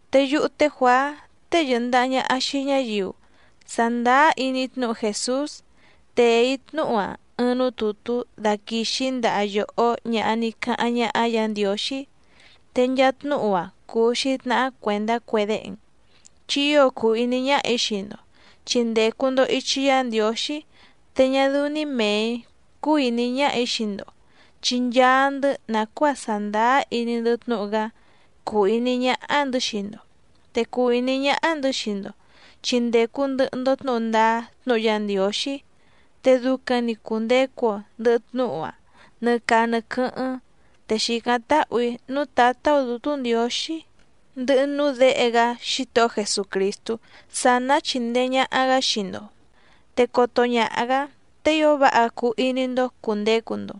Te yúhú té Juàá tée yɨ̀ndaha ñaha xii ñáyiu sàndáá iní tnúhu Jèsús, tèe‑í tnúhu‑a ɨɨⁿ núú tùtú daquìxi‑í ndaha yòhó ñaha ní cáháⁿ ñáhá Yǎ Ndiǒxí, te nchaa tnúhu‑a cùu‑xi tnahá cuèndá cue déhe‑n, chi ío cùu iní ñáhà‑í xii‑ndo, chi ndècu‑ndo ichi Yá Ndiǒxí. Te ñá dɨ́ú‑ní mèe‑í cúú ìní ñáhà‑í xii‑ndo, chi nchaa‑ndɨ́ nàcuáa sàndáá iní‑ndɨ́ tnúhu‑gá cúú ìní ñáhá‑ndɨ̌ xii‑ndo. Te cùu iní ñáhá‑ndɨ̌ xii‑ndo chi ndècu ndɨhɨ‑ndo tnúhu ndáá tnúhu Yá Ndiǒxí, te ducaⁿ‑ni cùndecu‑o ndɨhɨ tnúhu‑áⁿ nɨ caa nɨ quɨ́hɨ́ⁿ. Te xìcáⁿ táhù‑í núú Tǎtá‑ó Dǔtú Ndiǒxí, ndɨhɨ núú Děhe‑gá Xítohó Jesucrìstú sá ná chíndèe ñaha‑gá xii‑ndo, te coto ñaha‑gǎ te ío váha cuu iní‑ndó cùndecu‑ndo.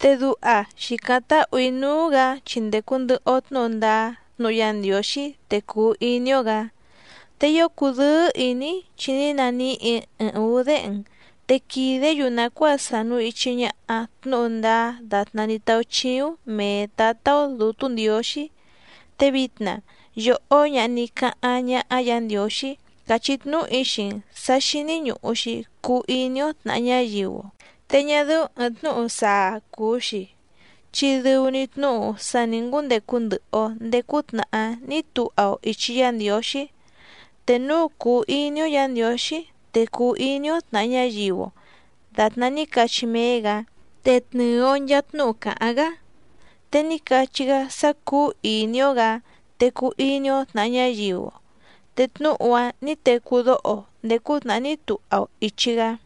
Te duha xìcáⁿ táhù‑í núú‑gǎ chi ndècu ndɨhɨ‑o tnúhu ndáá tnúhu Yá Ndiǒxí, te cùu iní‑ó‑gǎ. Te ío cùdɨ́ɨ́ ìní‑í, chi ní naníhì‑í ɨɨⁿ ǔú déhe‑n, te quìdé‑yu nàcuáa sànu ichi ñaha tnúhu ndáá dàtná ní táúchíúⁿ mèe Tátá‑ó Dǔtú Ndiǒxí. Te vitna yòhó ñaha ní cáháⁿ ñáhá Yǎ Ndiǒxí, càchí tnúhu‑í xii‑n sǎ xíní ñùhu‑xi cuu iní‑ó tnàha ñáyiu‑o. Te ñá dɨ́ú ɨ̀ɨⁿ tnúhu saa cùu‑xi, chi dɨu‑ni tnúhu sá nǐ ngúndecu ndɨhɨ‑o ndèé cútnàhá ní tuha‑o ìchi Yá Ndiǒxí. Te núu cùu iní‑ó Yǎ Ndiǒxí, te cùu iní‑ó tnàha ñáyiu‑o dàtná ní cachí méé‑gǎ, te tnɨ̀ɨ‑o nchaa tnúhu càháⁿ‑gá. Te ní cachí‑gá sá cúú ìní‑ó‑gǎ, te cuu iní‑ó tnàha ñáyiu‑o. Te tnúhu‑a ní tecú dóho‑o ndèé cútnàhá ní tuha‑o ìchi‑gá.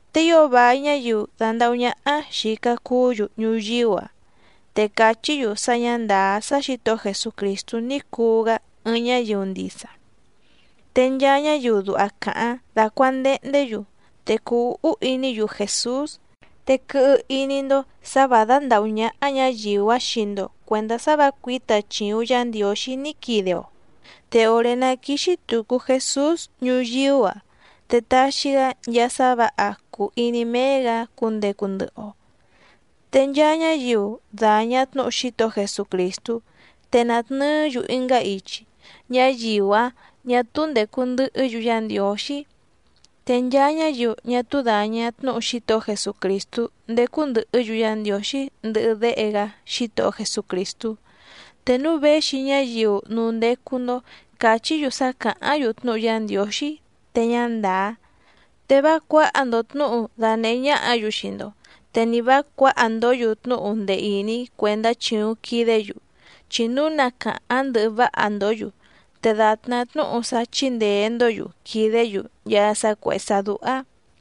Te ío vài ñáyiu dàndahú ñáhá xìca cuú‑yu ñuyíú‑a, te càchí‑yu sá ñǎ ndàá sá Xǐtohó Jesucrìstú ní cuu‑gá ɨɨⁿ ñáyiu ndisa. Te nchaa ñáyiu duha càháⁿ dácuàndehndé‑yu, te cùu úhú iní‑yu Jèsús. Te quɨhɨ iní‑ndó sǎ vǎ dándàhú ñáhá ñǎyiu‑áⁿ xii‑ndo cuèndá sá vǎ cuǐta chìuⁿ Yá Ndiǒxí ní quide‑o. Te òré ná quíxí tùcu Jesús ñuyíú‑a te taxi‑gá nchaa sá vǎha cùu iní méé‑gǎ cundecu ndɨhɨ‑o. Te nchaa ñáyiu dàña tnúhu Xítohó Jesucrìstú, te nàtnɨɨ́‑yu ɨngá ichi, ñáyiu‑áⁿ ñà túú ndècu ndɨhɨ́‑yu Yá Ndiǒxí. Te nchaa ñáyiu ñá túú dàña tnúhu Xítohó Jesucrìstú ndècu ndɨhɨ́‑yu Yá Ndiǒxí ndɨhɨ Déhe‑gá Xítohó Jesucrìstú. Te núu véxi ñáyiu núú ndécú‑ndó càchí‑yu sá càháⁿ‑yu tnúhu Yá Ndiǒxí te ñá ndàá, te vá cuǎha‑ndo tnǔhu danèhé ñáhǎ‑yu xii‑ndo, te ni vǎ cuǎha‑ndǒ‑yu tnúhu ndee ìní cuèndá chìuⁿ quidé‑yu. Chi núu na càháⁿ ndɨhɨ váha‑ndǒ‑yu, te dàtná tnúhu sá chíndèe‑ndó‑yu quìdé‑yu nchaa sá cuèhé sá dúhá.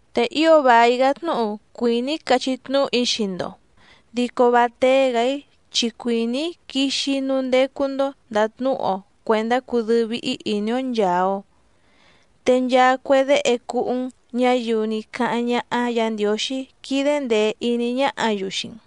Te ío vài‑gá tnúhu cuìní‑í cachí tnúhu‑í xii‑ndo, dico vá téé‑gǎ‑í chi cuìní‑í quixi‑í núú ndécú‑ndó ndàtnúhu‑o cuèndá cudɨ́ɨ́ víhí ìní‑ó nchàa‑o. Te nchaa cue déhe cúhú‑n, ñáyiu ní cáháⁿ ñáhá Yǎ Ndiǒxí quídé ndèe iní ñáhǎ‑yu xii‑n.